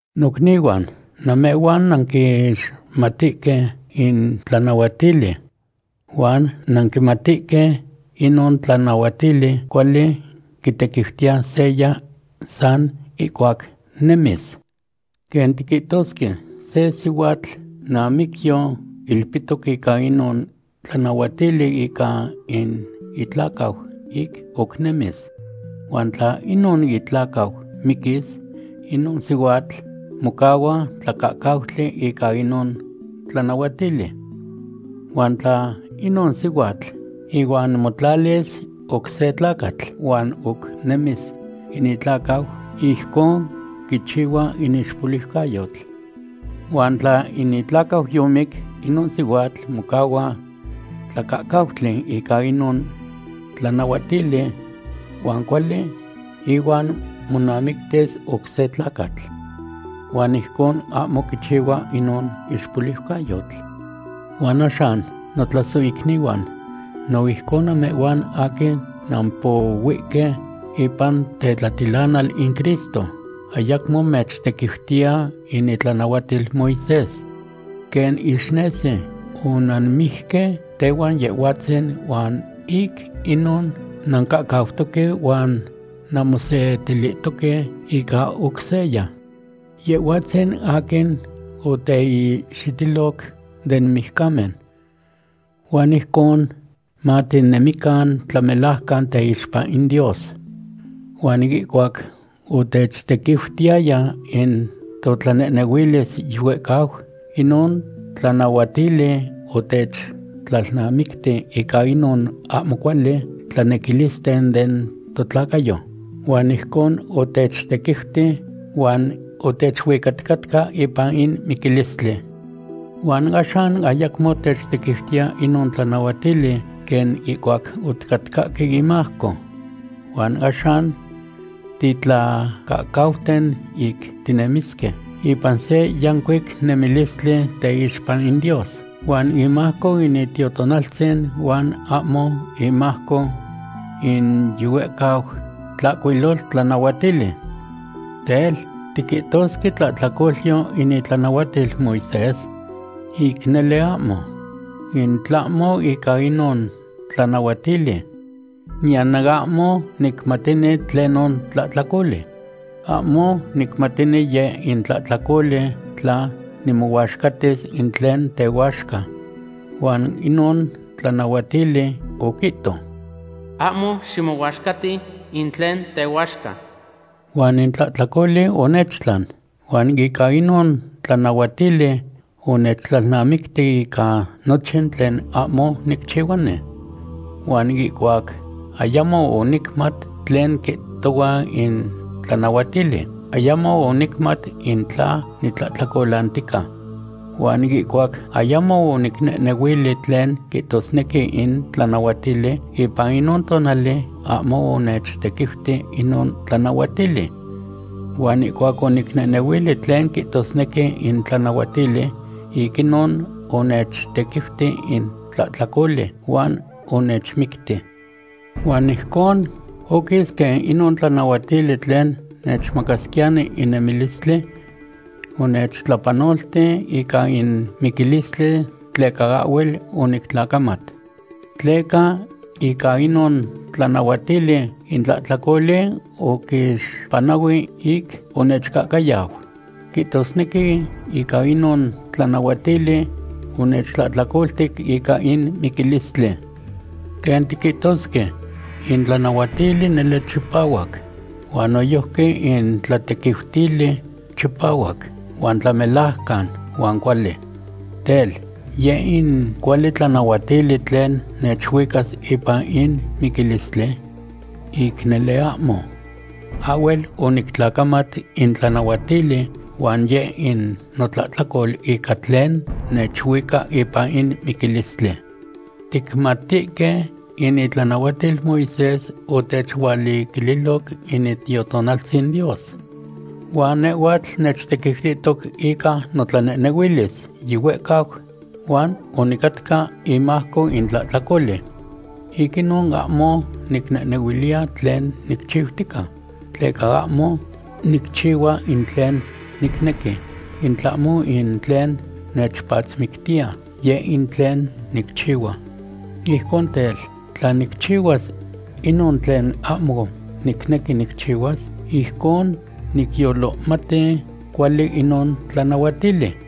Nocnihuan, namehhuan nanquixmatihque in tlanahuatili. Huan nanquimatihque inon tlanahuatili cuali quitequiutiya seya san ihcuac nemis. Quen tiquihtosque, se sihuatl namicyo ilpihtoc ica inon tlanahuatili ica in itlacau ic oc nemis. Huan tla inon itlacau miquis, inon sihuatl mocahua tlacahcautli ica inon tlanahuatili. Huan tla inon sihuatl ihuan motlalis oc se tlacatl huan oc nemis in itlacau, ijcon quichihua in ixpoliucayotl. Huan tla in itlacau yomic, inon sihuatl mocahua tlacahcautli ica inon tlanahuatili huan cuali ihuan monamictis oc se tlacatl. Huan ijcon ahmo quichihua inon ixpoliucayotl. Huan axan, notlasohicnihuan, no ijcon namehhuan aquin nampohuihque ipan tetlatilanal in Cristo, ayacmo mechtequiutiya in itlanahuatil Moisés. Quen ixnesi, onanmijque tehuan Yehhuatzin, huan ic inon nancahcautoque huan nanmosetilihtoque ica oc seya, Yehhuatzin aquin oteihxitiloc den mijcamen. Huan ijcon matinehnemican tlamelajcan teixpa in Dios. Huan ihcuac otechtequiutiyaya in totlanehnehuilis yihuehcau, inon tlanahuatili otechtlalnamicti ica inon ahmo cuali tlanequilisten den totlacayo, huan ijcon otechtequiuti huan otechuicaticatca ipan in miquilistli. Huan axan ayacmo techtequiutiya inon tlanahuatili quen ihcuac oticatcahque imajco, huan axan titlacahcauten ic tinemisque ipan se yancuic nemilistli teixpa in Dios, huan imajco in Itiotonaltzin huan ahmo imajco in yihuehcau tlahcuiloltlanahuatili. Tel, ¿tiquihtosque tlahtlacolyo in itlanahuatil Moisés? ¡Ic nele ahmo! In tlahmo ica inon tlanahuatili, niyan ahmo nicmatini tlenon tlahtlacoli. Ahmo nicmatini yeh in tlahtlacoli tla nimohuaxcatis in tlen tehuaxca. Huan inon tlanahuatili oquihto: “Ahmo ximohuaxcati in tlen tehuaxca.” Huan in tlahtlacoli onechtlan, huan ica inon tlanahuatili onechtlalnamicti ica nochin tlen ahmo nicchihuani. Huan ihcuac ayamo onicmat tlen quihtohua in tlanahuatili, ayamo onicmat in tla nitlahtlacolantica. Huan ihcuac ayamo onicnehnehuili tlen quihtosnequi in tlanahuatili, ipan inon tonali ahmo onechtequiuti inon tlanahuatili. Huan ihcuac onicnehnehuili tlen quihtosnequi in tlanahuatili, ic inon onechtequiuti in tlahtlacoli, huan onechmicti. Huan ijcon oquis quen inon tlanahuatili tlen nechmacasquiyani in nemilistli, onechtlapanolti ica in miquilistli tleca ahhuel onictlacamat. Tleca ica inon tlanahuatili in tlahtlacoli oquixpanahui ic onechcahcayau. Quihtosnequi ica inon tlanahuatili onechtlahtlacoltic ica in miquilistli. Quen tiquihtosque, in tlanahuatili nele chipahuac, huan noyojqui in tlatequiutili chipahuac, huan tlamelajcan, huan cuali. Tel, ¿yeh in cuali tlanahuatili tlen nechuicas ipan in miquilistli? ¡Ic nele ahmo! Ahhuel onictlacamat in tlanahuatili huan yeh in notlahtlacol ica tlen nechuica ipan in miquilistli. Ticmatihque in itlanahuatil Moisés otechualiquililoc in Itiotonaltzin Dios, huan nehhuatl nechtequiutihtoc ica notlanehnehuilis yihuehcau, huan onicatca imajco in tlahtlacoli. Ic inon ahmo nicnehnehuiliya tlen nicchiutica, tleca ahmo nicchihuas in tlen nicnequi, in tlahmo in tlen nechpatzmictiya, yeh in tlen nicchihua. Ijcon tel, tla nicchihuas inon tlen ahmo nicnequi nicchihuas, ijcon nicyolohmati cuali inon tlanahuatili.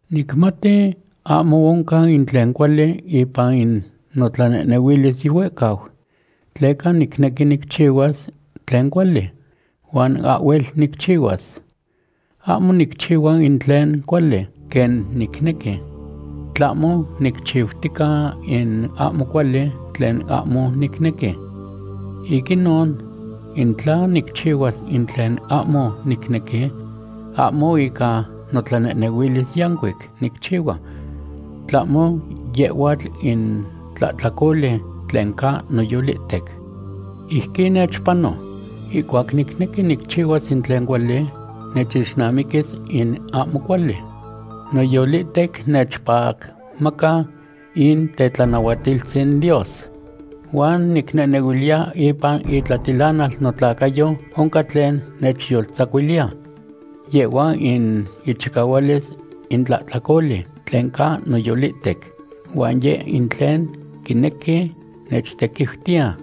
Nicmati ahmo oncan in tlen cuali ipan in notlanehnehuilis yihuehcau, tleca nicnequi nicchihuas tlen cuali, huan ahhuel nicchihuas. Ahmo nicchihua in tlen cuali, quen nicnequi. Tlahmo nicchiutica in ahmo cuali tlen ahmo nicnequi. Ic inon, in tla nicchihuas in tlen ahmo nicnequi, ahmo ica notlanehnehuilis yancuic nicchihua, tlahmo yehhuatl in tlahtlacoli tlen ca noyolihtec. Ijquin nechpano. Ihcuac nicnequi nicchihuas in tlen cuali, nechixnamiquis in ahmo cuali. Noyolihtec nechpacmaca in tetlanahuatiltzin Dios. Huan nicnehnehuiliya ipan itlatilanal notlacayo oncan tlen nechyoltzacuiliya. Yehhua in ichicahualis in tlahtlacoli tlen ca noyolihtec, huan yeh in tlen quinequi nechtequiutiya.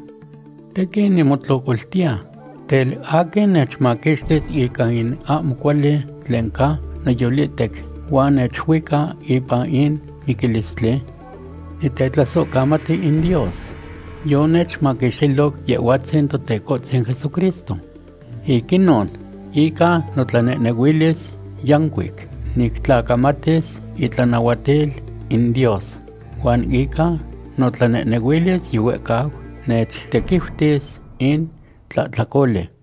¡Tequin nimotlocoltiya! Tel, ¿aquin nechmaquixtis ica in ahmo cuali tlen ca noyolihtec huan nechuica ipan in miquilistli? Nitetlasohcamati in Dios, yonechmaquixtilo Yehhuatzin Totecohtzin Jesucristo. Ic inon, ica notlanehnehuilis yancuic nictlacamatis itlanahuatil in Dios, huan ica notlanehnehuilis yihuehcau nechtequiutis in tlahtlacoli.